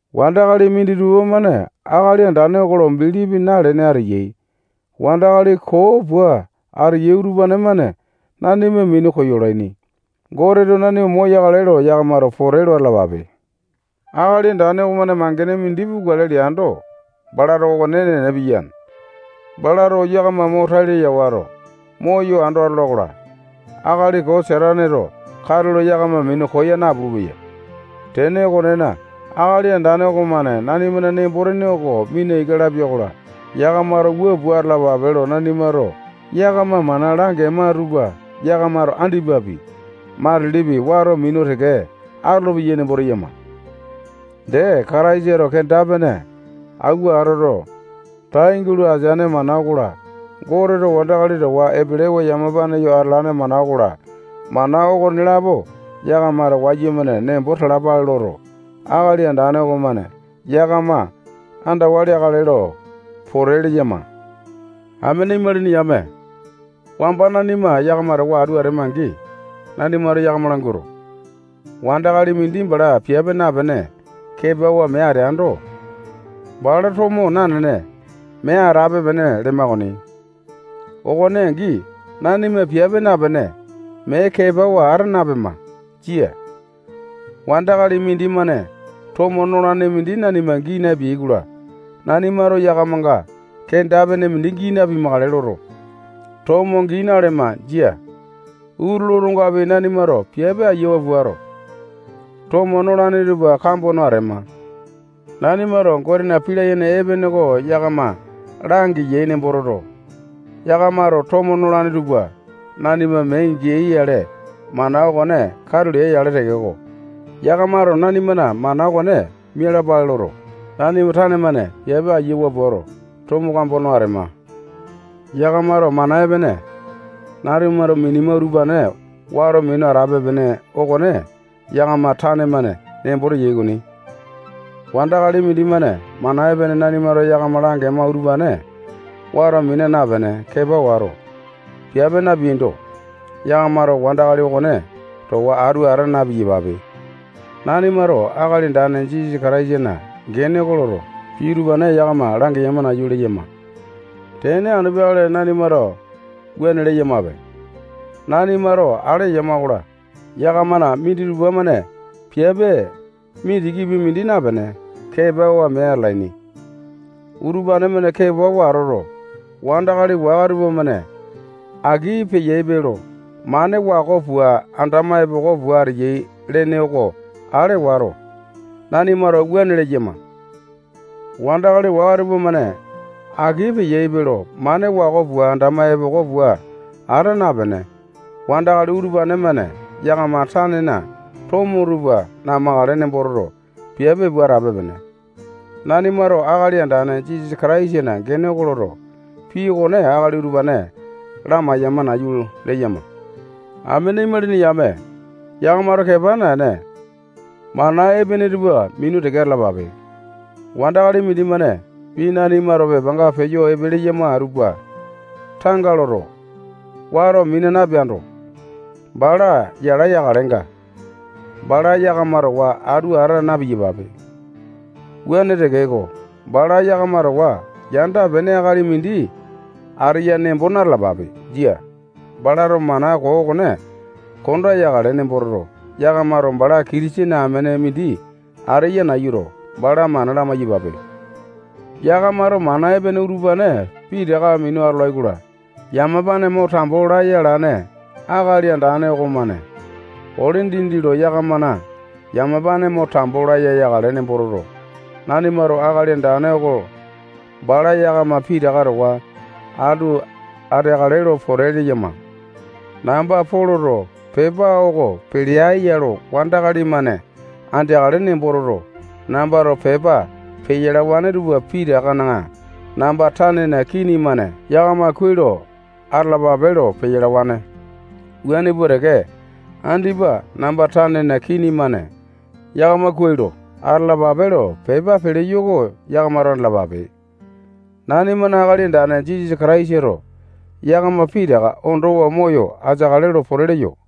Wandakali minditupa-mane Akali Andane oko lo bilipi nalene ateyai. Wandakali koo pua ateyai utupane-mane nanima minu koyolaini. Goteto nanima moyakale lo yakamato pote lo atalapape. Akali Andane okomane mangene mindi pukale leando, balato okone enene piyane. Balato yakama mo tai laya wato, moyo ando atola-kola, akali koo Sataneto katulo yakama minu koya napulu-peya. Tene okonena, Akali Andane okomane nanimana nembo-tene oko mina ika lapia-kola, yakamato wua pua atalapape lo nanimato yakama mana langema tupa yakamato andipapi, matilipi, wato minu teke atolopeyai nembo teyama. Dee, Kataisato kenda-pene awua atoto, tai gulo ateane mana okola, Goteto wandakali towa epelewa yamapa yo atalane mana okola, mana okonelapo yakamato wayumane nembo talapale loto, Akali Andane okomane yakama andawa leakale lo pote leyama. Amene imalini yame, wamba nanima yakama towa atu atema-angi, nanimato yakama languato, wandakali mindi bala piape napene, kepawa mee ateando, bala tomo nanene, mee atape-pene lema okoni. Okone angi, nanima piape napene, mee kepawa ata napema. Jia. Wandakali mindimane tomo nolane mindi nanima gii napeai-kola, nanimato yakamanga kenda-pene mindi gii napimakale loto, tomo gii nalema. Jia. Utulu otongapi nanimato piape ayiawa puato, tomo nolane tupa kambo no atema. Nanimato Gotena pii layene epene oko yakama langeyai nembo toto, yakamato tomo nolane tupa nanima mee geai-yale, mana okone katu lea-yale tekeko, yakamato nanimana mana okone mialapale loto, nanima tane-mane piape ayiawa puato, tomo kambo no atema. Yakamato mana epene nanimato minema utupane wato minu atape-pene okone yakama tane-mane nembo teyai okoni. Wandakali mindimane mana epene nanimato yakama langema utupane wato mina napene, kepa wato, piape napeando, yakamato wandakali okone towa atu ata na-piyapape. Nanimato Akali Andane Jisasa Kataisana gene oko loto, pii utupane yakama langeyama nayu leyama. Tene anu peakale nanimato wuane leyamape. Nanimato ale eyama-kola, yakamana minditupa-mane piape mindikipi mindi napene, kepawa mee atalaini. Utupane-mane kepawa atoto, wandakali waka tupamane aki peyaipe lo mane wako pua andama epoko pua ateyai lene oko ale wato, nanimato wuane leyama. Wandakali waka tupamane aki peyaipe lo mane wako pua andama epoko pua ata napene, wandakali utupane-mane yakama tanena tomo tupa namakale nembo toto, piape pua atape-pene. Nanimato Akali Andane Jisasa Kataisana gene oko loto, pii okone akali utupane lamaiyama nayu leyama. Amene imalini yame, yakamato kepa naene, mana epene tupa minu teke atalapape. Wandakali mindimane pii nanimato pepanga peyo epe leyama tupa tanga loto, wato mina napeando, bala yala yakalenga, bala yakama towa atu ata na-piyapape. Wuane tekeko, bala yakama towa yanda-pene akali mindi ateya nembo na-talapape. Jia. Balato mana koo okone konda yakale nembo toto, yakamato bala Kitisene amene mindi ateya nayuto, bala mana lamai-yapape. Yakamato mana epene utupane pitaka minu atolai-kola, yamapane mo tambo laya alane Akali Andane okomane ole dindi lo yakamana yamapane mo tambo laya yakale nembo toto, nanimato Akali Andane oko bala yakama pitaka towa atu ateakale lo pote leyama. Namba Poloto pepa oko pelea ya lo wandakali-mane andeakale nembo toto, nambato pepa peyalawane tupa pitakana namba tanena kini-mane yakama kuai lo atalapape lo peyalawane. Wuane pua teke, andipa namba tanena kini-mane yakamato kuai lo atalapape lo pepa peleyo oko yakamato andalapape. Nanimana Akali Andane Jisasa Kataisato yakama pitaka ondowa moyo ateakale lo pote leyo.